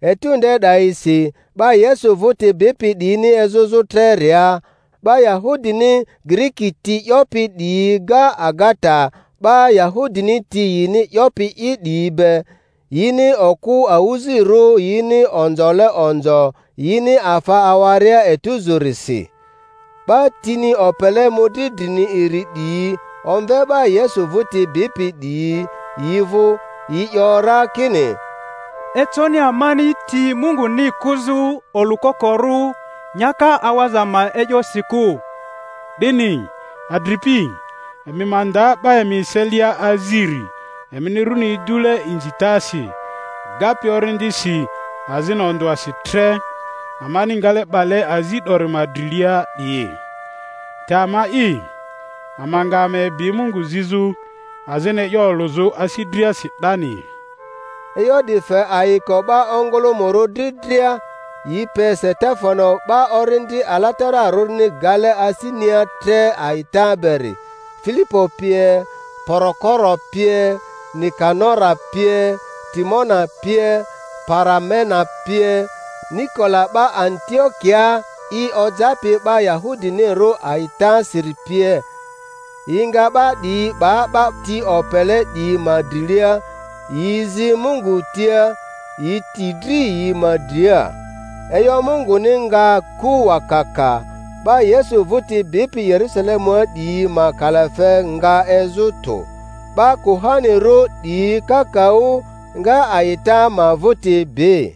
Etu nde 'dayisi 'ba Yesu vᴜti bipi 'diyini ezᴜzᴜ treria, 'ba Yahudini Giriki ti 'yopi 'diyi ga agata 'ba Yahudini ti yini 'yopi'i 'diyi be, yini okᴜ awᴜzirᴜ yini onzole onzo yini afa awaria etuzᴜrisi. 'Ba tini opele mᴜdri drini iri 'diyi omve 'ba Yesu vᴜti bipi 'diyi yi vᴜ, yi 'yo ra kini, Econi amani ti Munguni kᴜzᴜ olᴜkokorᴜ nyaka awaza ma e'yosi kᴜ. 'Dini, adripi, emi ma nda 'ba emi eselia aziri emini runi idule inzitasi, gapi Orindisi azini ondᴜasi tre, amani ngale 'bale azi 'dori ma drilia 'diyi. Te ama'i, ama nga ama ebi Mungu zizᴜ azini e'yo olᴜzᴜ asi driasi 'dani. E'yo 'di fe ayiko 'ba ongᴜlᴜmᴜrᴜ dri dria, yi pe Stefano 'ba Orindi Alatararᴜni gale asinia tre a'ita beri, Filipo pie, Porokoro pie, Nikanora pie, Timona pie, Para-mena pie, Nikola 'ba Antiokiaa i ojapi 'ba Yahudinirᴜ a'itasiri pie. Yi nga 'ba 'diyi 'ba 'ba ti opele 'diyi ma drilia, yi zi Mungu tia, yi ti dri yi ma dria. E'yo Munguni nga ku wakaka; 'ba Yesu vᴜti bipi Yerusalemua 'diyi ma kalafe nga ezᴜ tᴜ; 'ba kuhanirᴜ 'diyi kakaᴜ nga a'ita ma vᴜti bi.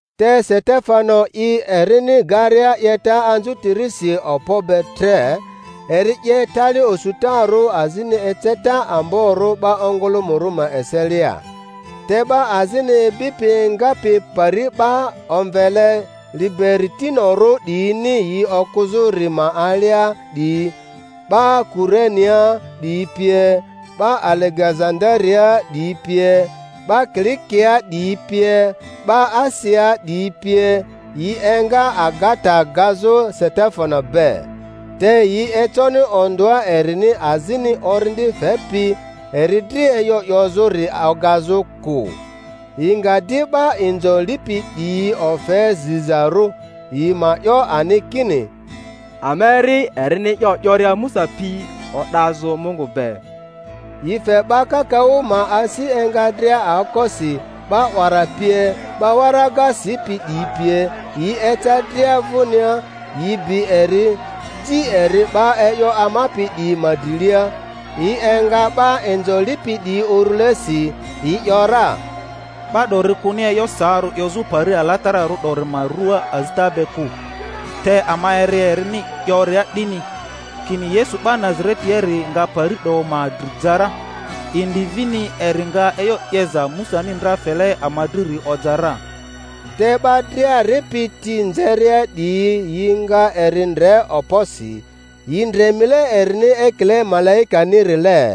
Te Setefano'i erini garia 'yeta anzᴜtirisi okpo be tre, eri 'ye tali osutarᴜ azini eceta amborᴜ 'ba ongᴜlᴜmᴜrᴜ ma eselia. Te 'ba azini ibipi engapi pari 'ba omvele Liberitinorᴜ 'diyini yi okᴜzᴜri ma alia 'diyi, 'ba Kurenea 'diyi pie, 'ba Alegezandariaa 'diyi pie, 'ba Kilikiaa 'diyi pie, 'ba Asiaa 'diyi pie, yi enga agata gazᴜ Setefano be. Te yi econi ondᴜa erini azini Orindi fepi eri dri e'yo 'yozᴜri ogazᴜ kᴜ. Yi nga di 'ba inzo lipi 'diyi ofe zizarᴜ, yi ma 'yo ani kini, Ama eri erini e'yo 'yoria Musa pi o'dazᴜ Mungu be. Yi fe 'ba kakaᴜ ma asi enga dria aokosi, 'ba 'wara pie, 'ba waraga sipi 'diyi pie, yi eca dria vᴜnia, yi bi eri, ji eri 'ba e'yo amapi 'diyi ma drilia, yi enga 'ba inzo lipi 'diyi urulesi, yi ‘yora, Ba 'dori kᴜni e'yo saarᴜ 'yozᴜ pari alatararᴜ 'dori ma ruaa azita be kᴜ; te ama eri erini 'yoria 'dini, kini Yesu 'ba Nazaretiari nga pari 'do ma dri ja ra, indi vini eri nga e'yo 'yeza Musani ndra fele ama driri oja ra. Te 'ba dria ripi ti nzeria 'diyi yi nga eri ndre okposi, yi ndre mile erini ekile malaikanirile.